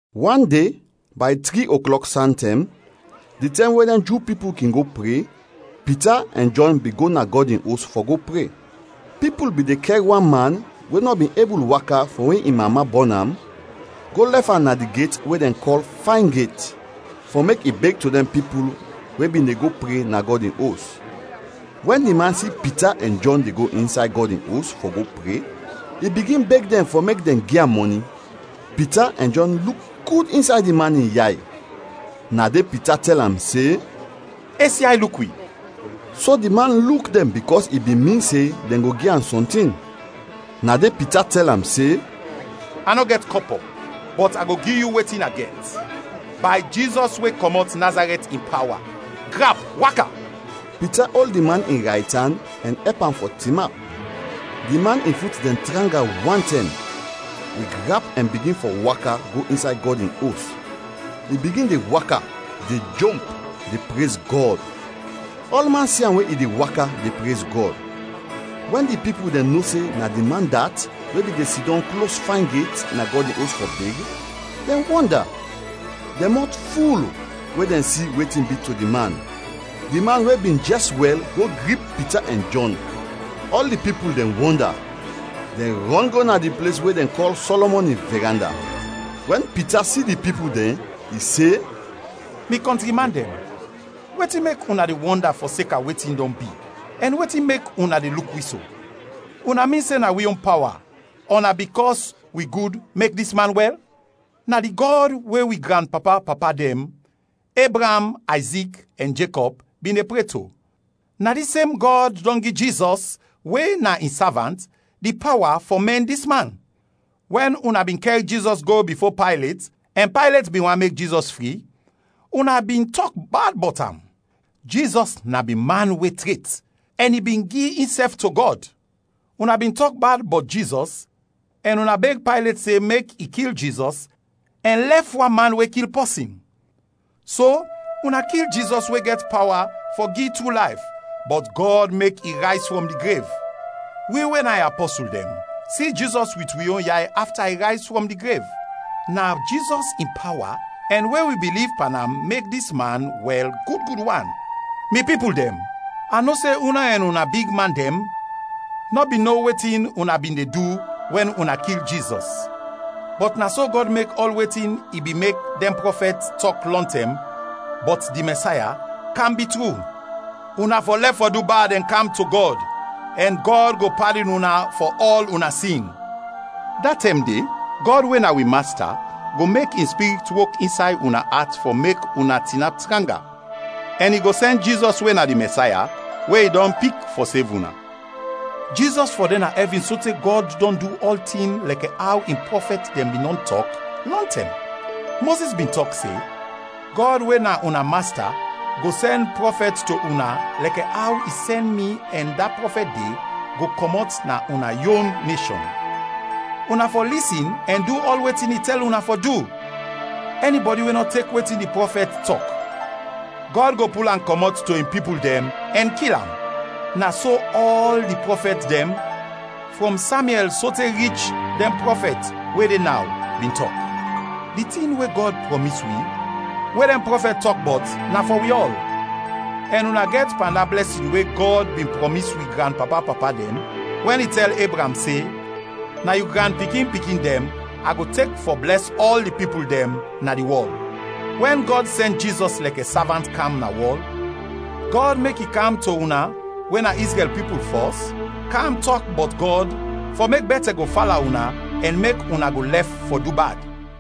Wan de, bay tri oklɔk santɛm, di tɛm we dɛn Ju pipul kin go pre, Pita ɛn Jɔn bin go na Gɔd in Os fɔ go pre. Pipul bin de kɛr wan man we nɔ bin ebul waka frɔm we in mama bɔn am, go lɛf am na di get we dɛn kɔl Fayn Get, fɔ mek i beg to dɛn pipul we bin de go pre na Gɔd in Os. Wɛn di man si Pita ɛn Jɔn de go insay Gɔd in Os fɔ go pre, i bigin beg dɛn fɔ mek dɛn gi am mɔni. Pita ɛn Jɔn luk gud insay di man in yay, na de Pita tɛl am se, “Es yay, luk wi!” So di man luk dɛn bikɔs i bin min se dɛn go gi am sɔntin. Na de Pita tɛl am se, “A nɔ gɛt kɔpɔ, bɔt a go gi yu wetin a gɛt. Bay Jizɔs we kɔmɔt Nazarɛt in pawa, grap, waka!” Pita ol di man in raytan ɛn ɛp am fɔ tinap. Di man in fut dɛn tranga wantɛm. I grap ɛn bigin fɔ waka go insay Gɔd in Os. I bigin de waka, de jomp, de prez Gɔd. Ɔlman si am we i de waka, de prez Gɔd. Wɛn di pipul dɛn no se na di man dat we bin de sidɔm klos Fayn Get na Gɔd in Os fɔ beg, dɛn wɔnda, dɛn mɔt ful we dɛn si wetin bi to di man. Di man we bin jɛs wɛl go grip Pita ɛn Jɔn; ɔl di pipul dɛn wɔnda, dɛn rɔn go na di ples we dɛn kɔl Sɔlɔmɔn in Viranda. Wɛn Pita si di pipul dɛn, i se, “Mi kɔntri man dɛn, wetin mek una de wɔnda fɔseka wetin dɔn bi ɛn wetin mek una de luk wi so? Una min se na wi yon pawa ɔ na bikɔs wi gud mek dis man wɛl? Na di Gɔd we wi granpapa-papa dɛn, Ebraam, Ayzik, ɛn Jekɔb bin de pre to, na dis sem Gɔd dɔn gi Jizɔs we na in savant, di pawa fɔ mɛn dis man. Wɛn una bin kɛr Jizɔs go bifo Paylet ɛn Paylet bin want mek Jizɔs fri, una bin tɔk bad bɔt am. Jizɔs na bin man we tret ɛn i bin gi insɛf to Gɔd. Una bin tɔk bad bɔt Jizɔs ɛn una beg Paylet se mek i kil Jizɔs ɛn lɛf wan man we kil pɔsin. So, una kil Jizɔs we gɛt pawa fɔ gi tru layf, bɔt Gɔd mek i rayz frɔm di grev. Wi, we na in apɔsul dɛn, si Jizɔs wit wi yon yay afta i rayz frɔm di grev. Na Jizɔs in pawa ɛn we wi biliv pan am mek dis man wɛl gud gud wan. “Mi pipul dɛn, a no se una ɛn una bigman dɛn nɔ bin no wetin una bin de du wɛn una kil Jizɔs. Bɔt na so Gɔd mek ɔl wetin i bin mek dɛn prɔfɛt tɔk lɔntɛm bɔt di Mɛsaya, kam bi tru. Una fɔ lɛf fɔ du bad ɛn kam to Gɔd, ɛn Gɔd go padin una fɔ ɔl una sin. Da tɛm de, Gɔd we na wi Masta go mek in Spirit wok insay una at fɔ mek una tinap tranga, ɛn i go sɛn Jizɔs we na di Mɛsaya we i dɔn pik fɔ sev una. Jizɔs fɔ de na ɛvin sote Gɔd dɔn du ɔltin lɛkɛ aw in prɔfɛt dɛn bin dɔn tɔk lɔntɛm. Mozis bin tɔk se, ‘Gɔd we na una Masta go sɛn prɔfɛt to una lɛkɛ aw i sɛn mi ɛn da prɔfɛt de go kɔmɔt na una yon neshɔn. Una fɔ lisin ɛn du ɔl wetin i tɛl una fɔ du. Ɛnibɛdi we nɔ tek wetin di prɔfɛt tɔk, Gɔd go pul am kɔmɔt to in pipul dɛn ɛn kil am!’ Na so ɔl di prɔfɛt dɛn, frɔm Samyɛl sote rich dɛn prɔfɛt we de naw, bin tɔk. Di tin we Gɔd prɔmis wi we dɛn prɔfɛt tɔk bɔt na fɔ wi ɔl, ɛn una gɛt pan da blɛsin we Gɔd bin prɔmis wi granpapa-papa dɛn, wɛn i tɛl Ebraam se, ‘Na yu granpikin-pikin dɛn a go tek fɔ blɛs ɔl di pipul dɛn na di wɔl.’ Wɛn Gɔd sɛn Jizɔs lɛkɛ savant kam na wɔl, Gɔd mek i kam to una we na Izrɛl pipul fɔs, kam tɔk bɔt Gɔd fɔ mek bɛtɛ go fala una ɛn mek una go lɛf fɔ du bad.”